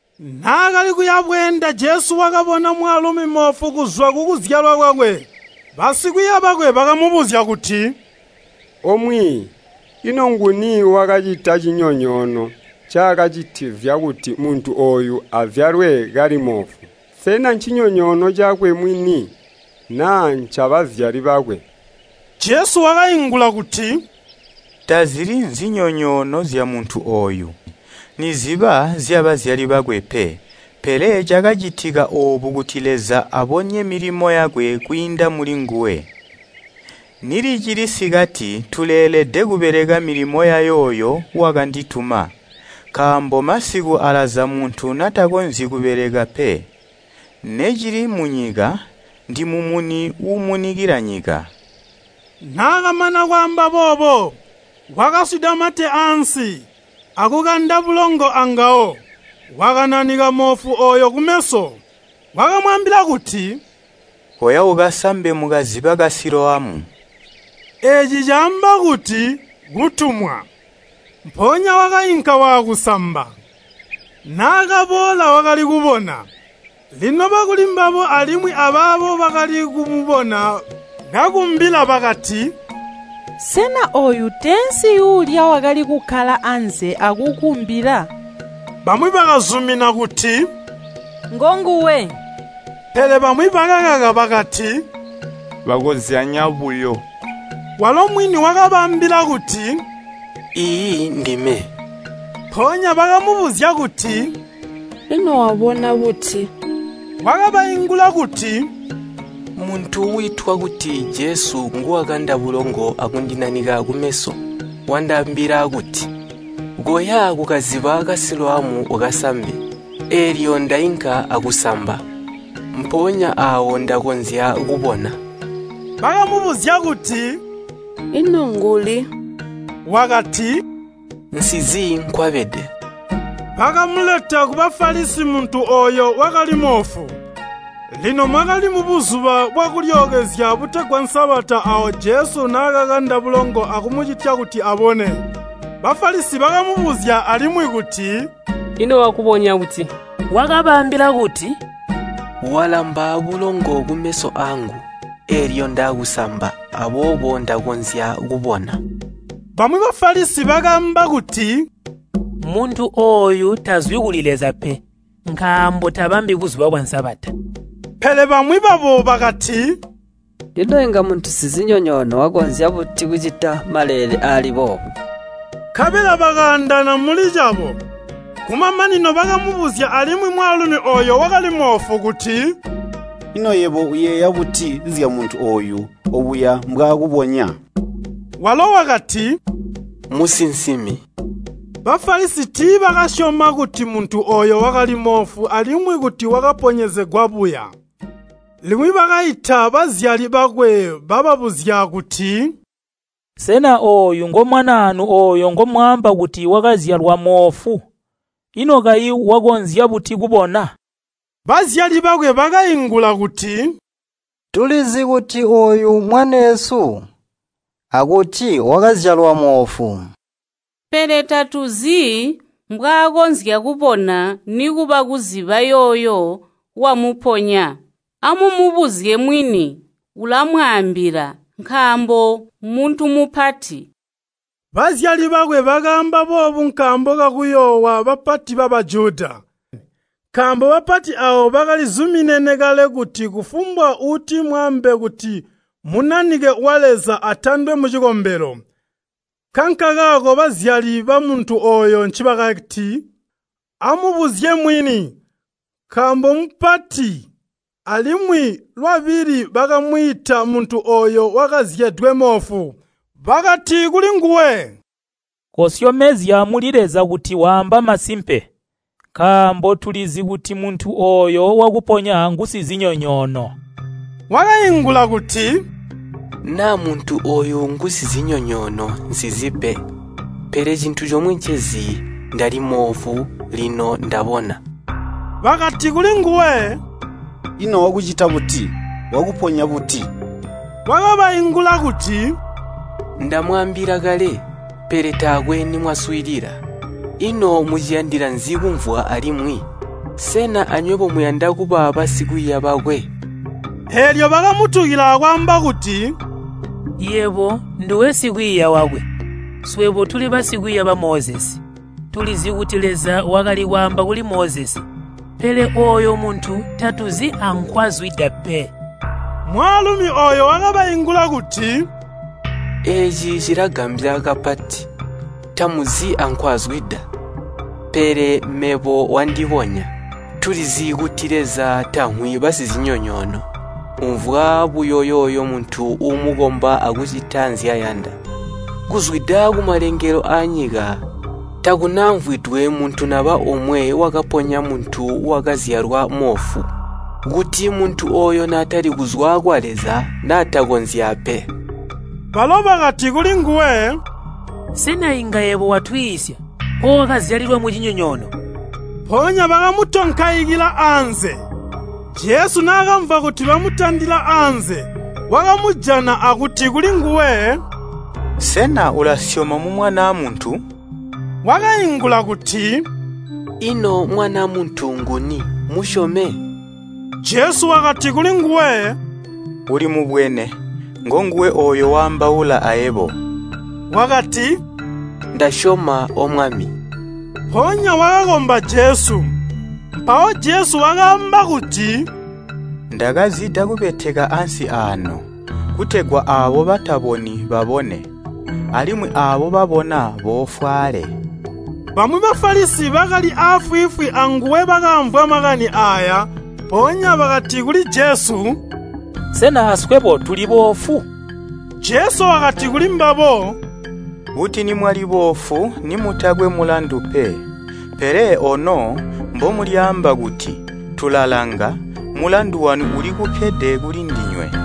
Naakali kuyabweenda Jesu wakabona mwaalumi moofu kuzwa kukuzyalwa kwakwe. Basikwiiya bakwe bakamubuzya kuti, “O Mwiiyi, ino nguni wakacita cinyonyoono cakacitizya kuti muntu ooyu azyalwe kali moofu? Sena ncinyonyoono cakwe mwini naa ncabazyali bakwe?” Jesu wakaingula kuti, “Tazili nzinyonyoono zyamuntu ooyu, niziba zyabazyali bakwe pe, pele cakacitika oobu kuti Leza abonye milimo yakwe kwiinda mulinguwe. Nilicili sikati tuleelede kubeleka milimo yayooyo wakandituma, nkaambo masiku alaza muntu natakonzyi kubeleka pe. Necili munyika, ndimumuni uumunikila nyika!” Naakamana kwaamba boobo, wakaswida mate ansi, akukanda bulongo angawo, wakananika moofu ooyo kumeso. Wakamwaambila kuti, “Koya ukasambe mukaziba ka Siloamu.” (Eeci caamba kuti, “Kutumwa.”) Mpoonya wakainka waakusamba. Naakaboola wakali kubona. Lino bakulimbabo alimwi abaabo bakali kumubona kakumbila bakati, “Sena ooyu teensi yuulya wakali kukkala anze akukumbila?” Bamwi bakazumina kuti, “Ngonguwe,” pele bamwi bakakaka bakati, “Bakozyanya buyo.” Walo mwini wakabaambila kuti, “Iiyi, ndime.” Mpoonya bakamubuzya kuti, “Ino wabona buti?” Wakabaingula kuti, “Muntu wiitwa kuti Jesu nguwakanda bulongo akundinanika kumeso. Wandaambila kuti, ‘Koya kukaziba ka Siloamu ukasambe.’ Eelyo ndainka akusamba. Mpoonya aawo ndakonzya kubona.” Bakamubuzya kuti, “Ino nguli?” Wakati, “Nsizi nkwabede.” Bakamuleta ku Bafalisi muntu ooyo wakali moofu. Lino mwakali mu Buzuba bwa Kulyookezya butegwa Sabata aawo Jesu naakakanda bulongo akumucitya kuti abone. Bafalisi bakamubuzya alimwi kuti, “Ino wakubonya buti?” Wakabaambila kuti, “Walamba bulongo kumeso aangu, eelyo ndaakusamba, aboobo ndakonzya kubona.” Bamwi Bafalisi bakaamba kuti, “Muntu ooyu tazwi kuli Leza pe, nkaambo tabambi Buzuba bwa Sabata.” Pele bamwi babo bakati, “Ino inga muntu sizinyonyoono wakonzya buti kucita maleele aali boobu?” Nkabela bakaandaana muli cabo. Kumamanino bakamubuzya alimwi mwaalumi ooyo wakali moofu kuti, “Ino yebo uyeeya buti zyamuntu ooyu obuya mbwaakubonya?” Walo wakati, “Musinsimi.” Bafalisi tiibakasyoma kuti muntu ooyo wakali moofu alimwi kuti wakaponyezegwa buya, limwi bakaita bazyali bakwe. Bababuzya kuti, “Sena ooyu ngomwanaanu ooyo ngomwaamba kuti wakazyalwa moofu? Ino kayi wakonzya buti kubona?” Bazyali bakwe bakaingula kuti. “Tulizi kuti ooyu mmwaneesu, akuti wakazyalwa moofu, pele tatuzi mbwaakonzya kubona, nikuba kuziba yooyo wamuponya. Amumubuzye mwini, ulamwaambila, nkaambo mmuntu mupati.” Bazyali bakwe bakaamba boobu nkaambo kakuyoowa bapati ba Bajuda, nkaambo bapati aabo bakali zuminene kale kuti kufumbwa uuti mwaambe kuti Munanike wa Leza atandwe mucikombelo. Nkankakaako bazyali bamuntu ooyo ncibakati, “Amumubuzye mwini, nkaambo mmupati.” Alimwi, lwabili bakamwiita muntu ooyo wakazyedwe moofu, bakati kulinguwe, “Kosyomezya muli Leza kuti waamba masimpe, nkaambo tulizi kuti muntu ooyo wakuponya ngusizinyonyoono.” Wakaingula kuti, “Naa muntu ooyo ngusizinyonyoono, nsizi pe, pele cintu comwe ncezi, ndalimoofu, lino ndabona.” Bakati kulinguwe, “Ino wakucita buti? Wakuponya buti?” Wakabaingula kuti, “Ndamwaambila kale, pele taakwe nimwaswiilila. Ino muciyandila nzi kumvwa alimwi? Sena anywebo muyanda kuba basikwiiya bakwe?” Eelyo bakamutukila akwaamba kuti, “Yebo nduwe sikwiiya wakwe, swebo tuli basikwiiya ba Mozesi. Tulizi kuti Leza wakali kwaamba kuli Mozesi, pele ooyo muntu tatuzi ankwazwida pe.” Mwaalumi ooyo wakabaingula kuti, “Eeci cilagambya kapati! Tamumuzi ankwazwida, pele mebo wandibonya. Tulizi kuti Leza tamvwi basizinyonyoono, umvwa buyo yooyo muntu uumukomba akucita nzyayanda. Kuzwida kumalengelo aanyika takunamvwidwe muntu naba omwe wakaponya muntu wakazyalwa moofu. Kuti muntu ooyo naatali kuzwa kwa Leza, naatakonzya pe.” Balo bakati kulinguwe, “Sena inga yebo watwiisya, ookazyalilwa mucinyonyoono?” Mpoonya bakamutonkaikila anze. Jesu naakamvwa kuti bamutandila anze, wakamujana akuti kulinguwe, “Sena ulasyoma mu Mwanaa Muntu?” Wakaingula kuti, “Ino Mwanaa Muntu nguni, mmusyome?” Jesu wakati kulinguwe, “Ulimubwene, ngonguwe ooyo waambaula ayebo.” Wakati, “Ndasyoma, O Mwami.” Mpoonya wakakomba Jesu. Mpawo Jesu wakaamba kuti, “Ndakazida kubeteka ansi aano, kutegwa aabo bataboni babone, alimwi aabo babona boofwaale.” Bamwi ba Bafalisi bakali aafwiifwi anguwe bakaamvwa makani aaya, mpoonya bakati kuli Jesu, “Sena aswebo tuliboofu?” Jesu wakati kulimbabo, “Kuti nimwali boofu nimutakwe mulandu pe, pele ono mbomulyaamba kuti, ‘Tulalanga,’ mulandu wanu ulikukkede kuli ndinywe.